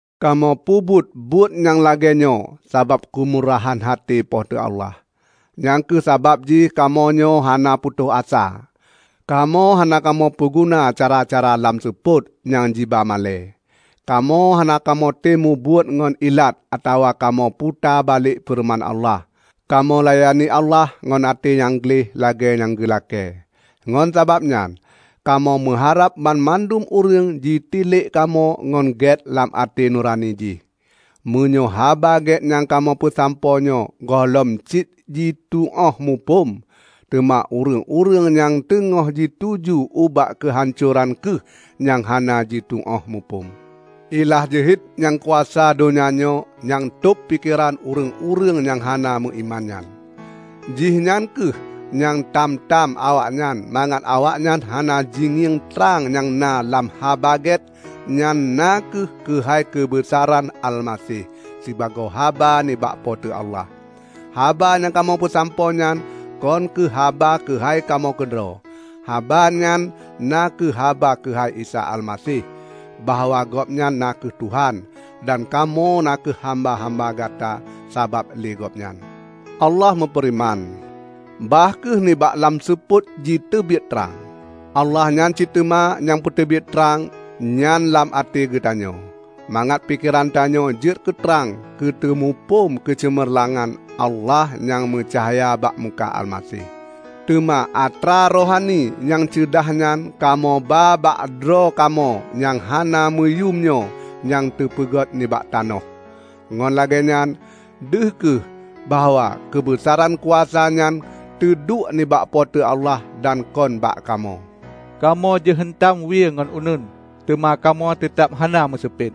Kamoe peubuet-buet nyang lagée nyoe sabab keumurahan até Po teu Allah. Nyang kheueh sabab jih kamoenyoe hana putôh asa. Kamoe hana kamoe peuguna cara-cara lam seupôt nyang jiba malée. Kamoe hana kamoe tem mubuet ngon ilat atawa kamoe puta balek feureuman Allah. Kamoe layani Allah ngon até nyang gleh lagée nyang geu lakée. Ngon sabab nyan, kamoe meuharab banmandum ureuëng jitilek kamoe ngon gét lam até nurani jih. Meunyoe Haba Gét nyang kamoe peusampoe nyoe gohlom cit jituóh muphom, teuma ureuëng-ureuëng nyang teungoh jituju ubak keuhancoran kheueh nyang hana jituóh muphom. Ilah jeuhet nyang kuasa donya nyoe nyang tôb pikeran ureuëng-ureuëng nyang hana meuiman nyan. Jihnyan kheueh nyang tam-tam awaknyan mangat awaknyan hana jingieng trang nyang na lam Haba Gét nyan na kheueh keuhai keubeusaran Almaseh, sibagoe haba nibak Po teu Allah. Haba nyang kamoe peusampoe nyan kon kheueh haba keuhai kamoe keudroe. Haba nyan na kheueh haba keuhai Isa Almaseh; bahwa Gobnyan na kheueh Tuhan; dan kamoe na kheueh hamba-hamba gata sabab lé Gobnyan. Allah meufeureuman, "Bah kheueh nibak lam seupôt jiteubiet trang," Allah nyan cit teuma nyang peuteubiet trang nyan lam até geutanyoe, mangat pikeran tanyoe jeuet keutrang keu teumuphom keuceumeurlangan Allah nyang meucahya bak muka Almaseh. Teuma atra rohani nyang ceudahnyan kamoe ba bak droe kamoe nyang hana meuyuem nyoe nyang teupeugét nibak tanoh. Ngon lagée nyan deuh kheueh bahwa keubeusaran kuasa nyan teuduek nibak Po teu Allah dan kon bak kamoe. Kamoe jiheuntam wie ngon uneuen, teuma kamoe teutab hana meuseupet.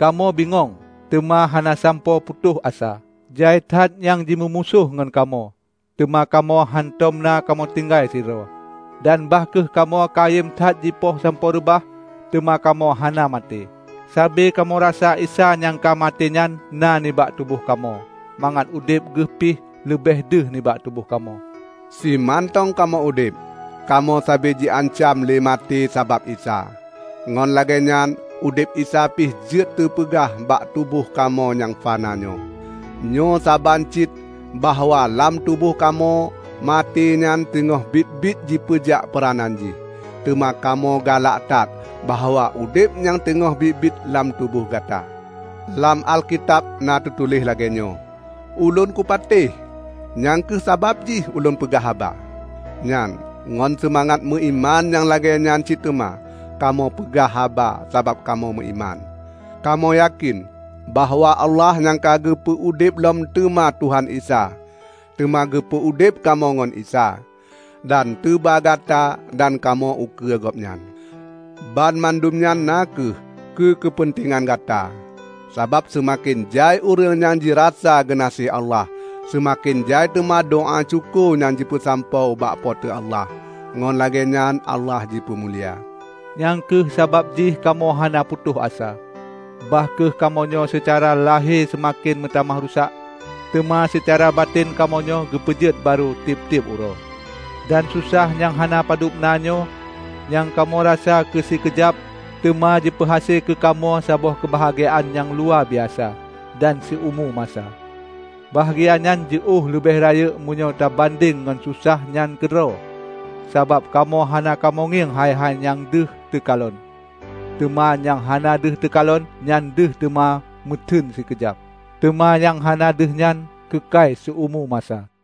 Kamoe bingong, teuma hana sampoe putôh asa. Jai that nyang jimeumusoh ngon kamoe, teuma kamoe hántom na kamoe tinggai sidroe. Dan bah kheueh kamoe kayém that jipoh sampoe reubah, teuma kamoe hana maté. Sabe kamoe rasa Isa nyang ka maté nyan na nibak tuboh kamoe, mangat udeb geuh pi leubeh deuh nibak tuboh kamoe. Simantong kamoe udeb, kamoe sabe jiancam lé maté sabab Isa, ngon lagée nyan udeb Isa pih jeuet teupeugah bak tuboh kamoe nyang fana nyoe. Nyoe saban cit bahwa lam tuboh kamoe maté nyan teungoh biet-biet jipeujak peuranan jih, teuma kamoe galak that bahwa udeb nyang teungoh biet-biet lam tuboh gata. Lam Alkitab na teutuléh lagée nyoe, "Ulôn kupatéh, nyang kheueh sabab jih ulôn peugah haba." Nyan, ngon seumangat meuiman nyang lagée nyan cit teuma, kamoe peugah haba sabab kamoe meuiman. Kamoe yakén bahwa Allah nyang ka geupeu udeb lom teuma Tuhan Isa, teuma geupeu udeb kamoe ngon Isa, dan teuba gata dan kamoe ukeue Gobnyan. Banmandum nyan na kheueh keu keupeuntengan gata. Sabab seumaken jai ureuëng nyang jirasa geunaséh Allah, seumaken jai teuma doá syukoe nyang jipeusampoe ubak Po teu Allah; ngon lagée nyan Allah jipeumulia. Nyang kheueh sabab jih kamoe hana putôh asa. Bah kheueh kamoenyoe seucara lahé seumaken meutamah rusak, teuma seucara batén kamoenyoe geupeujeuet barô tieb-tieb uroe. Dan susah nyang hana padub na nyoe, nyang kamoe rasa keusikeujab, teuma jipeuhase keu kamoe saboh keubahgiaan nyang luwabiasa dan siumu masa. Bahgia nyan jiôh leubeh rayeuk meunyoe teubandeng ngon susah nyan keudroe. Sabab kamoe hana kamoe ngieng hai-hai nyang deuh teukalon, teuma nyang hana deuh teukalon. Nyang deuh teuma meuteun sikeujab, teuma nyang hana deuh nyan keukai siumu masa.